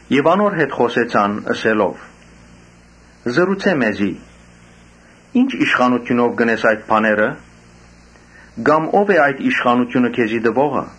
Եւ անոր հետ խօսեցան՝ ըսելով. «Ըսէ մեզի, ի՞նչ իշխանութիւնով կ’ընես այդ բաները. կամ ո՞վ է այդ իշխանութիւնը քեզի տուողը»։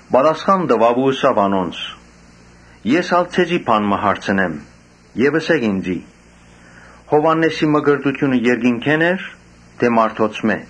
Պատասխան տուաւ ու ըսաւ անոնց. «Ես ալ ձեզի բան մը հարցնեմ եւ ըսէք ինծի. ‘Յովհաննէսին մկրտութիւնը երկնքէ՞ն էր թէ մարդոցմէ’»։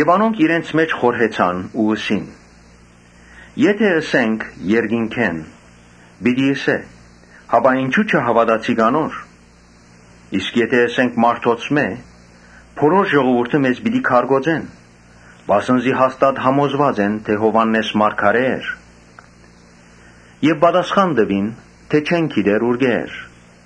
Անոնք իրենց մէջ խորհեցան ու ըսին. «Եթէ ըսենք՝ ‘Երկնքէն’, պիտի ըսէ, ‘Հապա ինչո՞ւ չհաւատացիք անոր’. իսկ եթէ ըսենք՝ ‘Մարդոցմէ’, բոլոր ժողովուրդը մեզ պիտի քարկոծեն, վասն զի հաստատ համոզուած էին թէ՝ Յովհաննէս մարգարէ էր»։ Պատասխան տուին թէ չեն գիտեր ուրկէ՛ էր։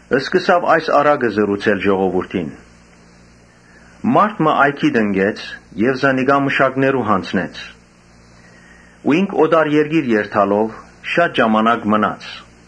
Յիսուս այս առակը ըսաւ ժողովուրդին. «Մարդ մը այգի տնկեց եւ զանիկա մշակներու յանձնեց ու ինք օտար երկիր երթալով՝ շատ ժամանակ մնաց։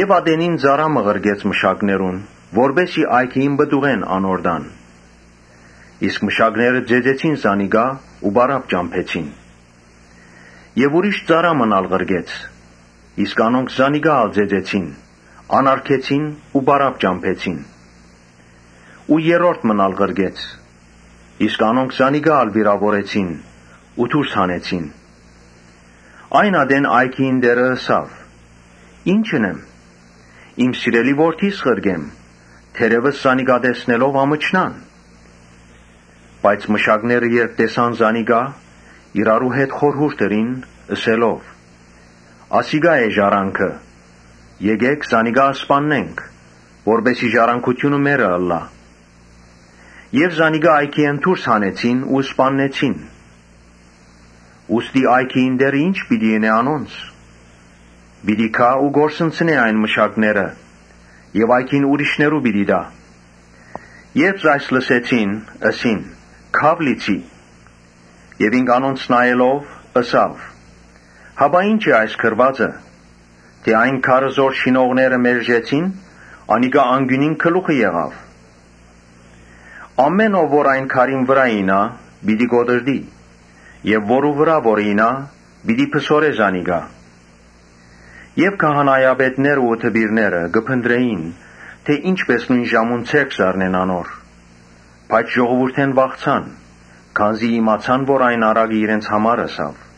Ատենին՝ ծառայ մը ղրկեց մշակներուն, որպէս զի այգիին պտուղէն անոր տան. իսկ մշակները ծեծեցին զանիկա ու պարապ ճամբեցին։ Ուրիշ ծառայ մըն ալ ղրկեց. անոնք զանիկա ալ ծեծեցին, անարգեցին ու պարապ ճամբեցին։ Երրորդ մըն ալ ղրկեց. անոնք զանիկա ալ վիրաւորեցին ու դուրս հանեցին։ Այն ատեն այգիին տէրը ըսաւ. ‘Ի՞նչ ընեմ, իմ սիրելի որդիս ղրկեմ, թերեւս զանիկա տեսնելով ամչնան’։ Բայց մշակները երբ տեսան զանիկա, իրարու հետ խորհուրդ ըրին՝ ըսելով. ‘Ասիկա է ժառանգորդը, եկէք զանիկա սպաննենք, որպէս զի ժառանգութիւնը մեզի մնա’։ Զանիկա այգիէն դուրս հանեցին ու սպաննեցին։ Ուստի այգիին տէրը ի՞նչ պիտի ընէ անոնց։ Պիտի գայ ու կորսնցնէ այն մշակները եւ այգին ուրիշներու պիտի տայ»։ Երբ այս լսեցին, ըսին. «Քա՛ւ լիցի»։ Ինք անոնց նայելով՝ ըսաւ. «Հապա ի՞նչ է այս գրուածը, թէ ‘Այն քարը որ շինողները մերժեցին, անիկա անկիւնին գլուխը եղաւ’։ Ամէն ով որ այն քարին վրայ իյնայ, պիտի կոտրտի եւ որու վրայ որ իյնայ, պիտի փսորէ զանիկա»։ Քահանայապետներն ու դպիրները կը փնտռէին թէ ի՛նչպէս նոյն ժամուն ձեռք զարնեն անոր, բայց ժողովուրդէն վախցան. քանզի իմացան որ այն առակը իրենց համար ըսաւ։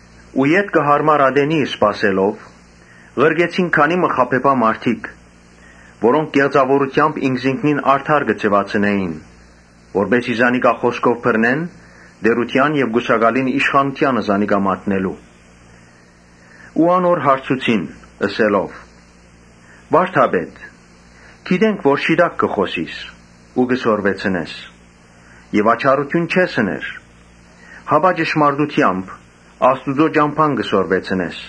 Ետքը յարմար ատենի սպասելով, ղրկեցին քանի մը խաբեբայ մարդիկ, որոնք կեղծաւորութեամբ ինքզինքնին արդար կը ձեւացնէին, որպէս զի զանիկա խօսքով բռնեն՝ տէրութեան եւ կուսակալին իշխանութեանը մատնելու համար։ Անոր հարցուցին՝ ըսելով. «Վա՛րդապետ, գիտենք որ ճշմարտախօս ես եւ աչառութիւն չես ըներ, հապա ճշմարտութեամբ Աստուծոյ ճամբան կը սորվեցնես։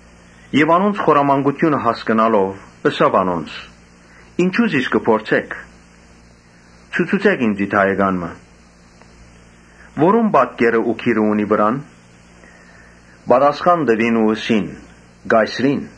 Յիսուս անոնց խորամանկութիւնը հասկնալով՝ ըսաւ անոնց. «Ինչո՞ւ զիս կը փորձէք։ Ցուցուցէք ինծի դահեկան մը։ Որո՞ւն պատկերը ու գիրը կան վրան»։ Պատասխան տուին ու ըսին. «Կայսրին»։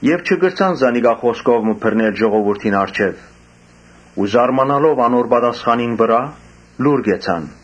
Եւ չկրցան զանիկա խօսքով մը բռնել ժողովուրդին առջեւ ու զարմանալով անոր պատասխանին վրայ՝ լուռ կեցան։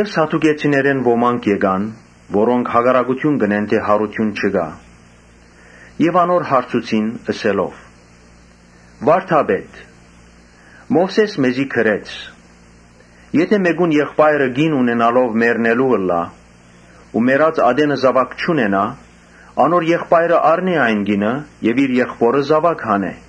Սադուկեցիներէն ոմանք եկան (որոնք կ’ըսէին թէ յարութիւն չկայ,) եւ անոր հարցուցին՝ Ըսելով. «Վա՛րդապետ, Մովսէս մեզի գրեց. ‘Եթէ մէկուն եղբայրը ամուսնանայ ու մեռնի ու մեռած ատենը զաւակ չունենայ, անոր եղբայրը առնէ այն կինը եւ իր եղբօրը զաւակ տայ’։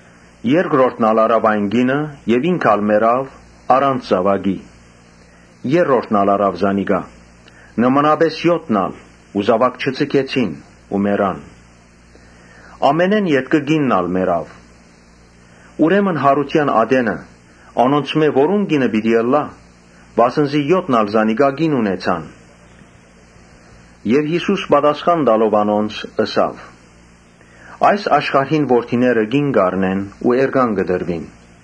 Երկրորդն ալ առաւ այն կինը եւ ինք ալ մեռաւ առանց զաւակի։ Երրորդն ալ առաւ զանիկա. նմանապէս եօթն ալ ու զաւակ չձգեցին ու մեռան։ Ամենէն ետքը կինն ալ մեռաւ։ Ուրեմն յարութեան ատենը անոնցմէ որո՞ւն կինը պիտի ըլլայ, վասն զի եօթն ալ զանիկա կին ունեցան»։ Յիսուս պատասխան տալով անոնց՝ ըսաւ. «Այս աշխարհին որդիները կին կ’առնեն ու էրկան կը տրուին։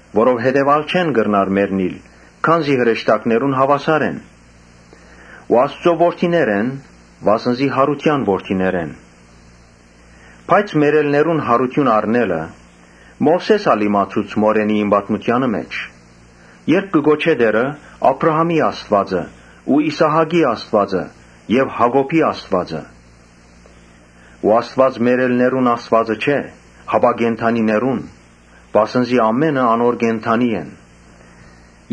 Որովհետեւ ա՛լ չեն կրնար մեռնիլ. քանզի հրեշտակներուն հաւասար են ու Աստուծոյ որդիներ եւ յարութեան որդիներ են։ Բայց մեռելներուն յարութիւն առնելը Մովսէս ալ իմացուց մորենիին պատմութեանը մէջ, երբ կը կոչէ. ‘Տէրը՝ Աբրահամին Աստուածը ու Իսահակին Աստուածը եւ Յակոբին Աստուածը’։ Աստուած մեռելներուն Աստուածը չէ, հապա կենդանիներուն, վասն զի ամէնքը անոր կենդանի են»։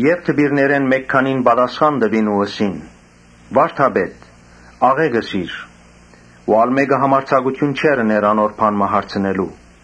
Դպիրներէն մէկ քանին պատասխան տուին ու ըսին. «Վա՛րդապետ, աղէկ ըսիր»։ Ու ա՛լ մէկը չէր համարձակիր անոր բան մը հարցնել։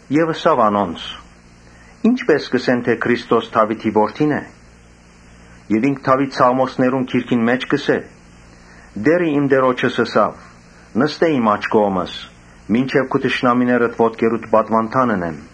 Բայց ըսաւ անոնց. «Ի՞նչպէս կ’ըսեն թէ Քրիստոս Դաւիթին որդին է։ Երբ Դաւիթ սաղմոսներու գրքին մէջ կ’ըսէ. «Տէրը իմ Տէրոջս ըսաւ. ‘Նստէ իմ աջ կողմս, Մինչեւ քու թշնամիներդ ոտքերուդ պատուանդան ընեմ’։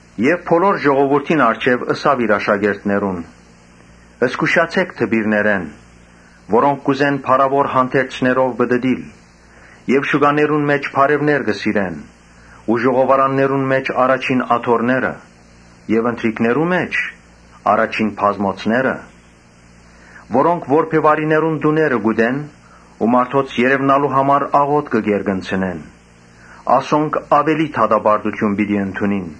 Բոլոր ժողովուրդին առջեւ ըսաւ իր աշակերտներուն. «Զգուշացէ՛ք դպիրներէն, որոնք կ’ուզեն փառաւոր հանդերձներով պտըտիլ եւ շուկաներուն մէջ բարեւներ կը սիրեն ու ժողովարաններուն մէջ՝ առաջին աթոռները եւ ընթրիքներու մէջ՝ առաջին բազմոցները. Անոնք որբեւարիներուն տուները կ’ուտեն ու մարդոց երեւնալու համար աղօթքը կ’երկնցնեն. անոնք աւելի դատապարտութիւն պիտի ընդունին»։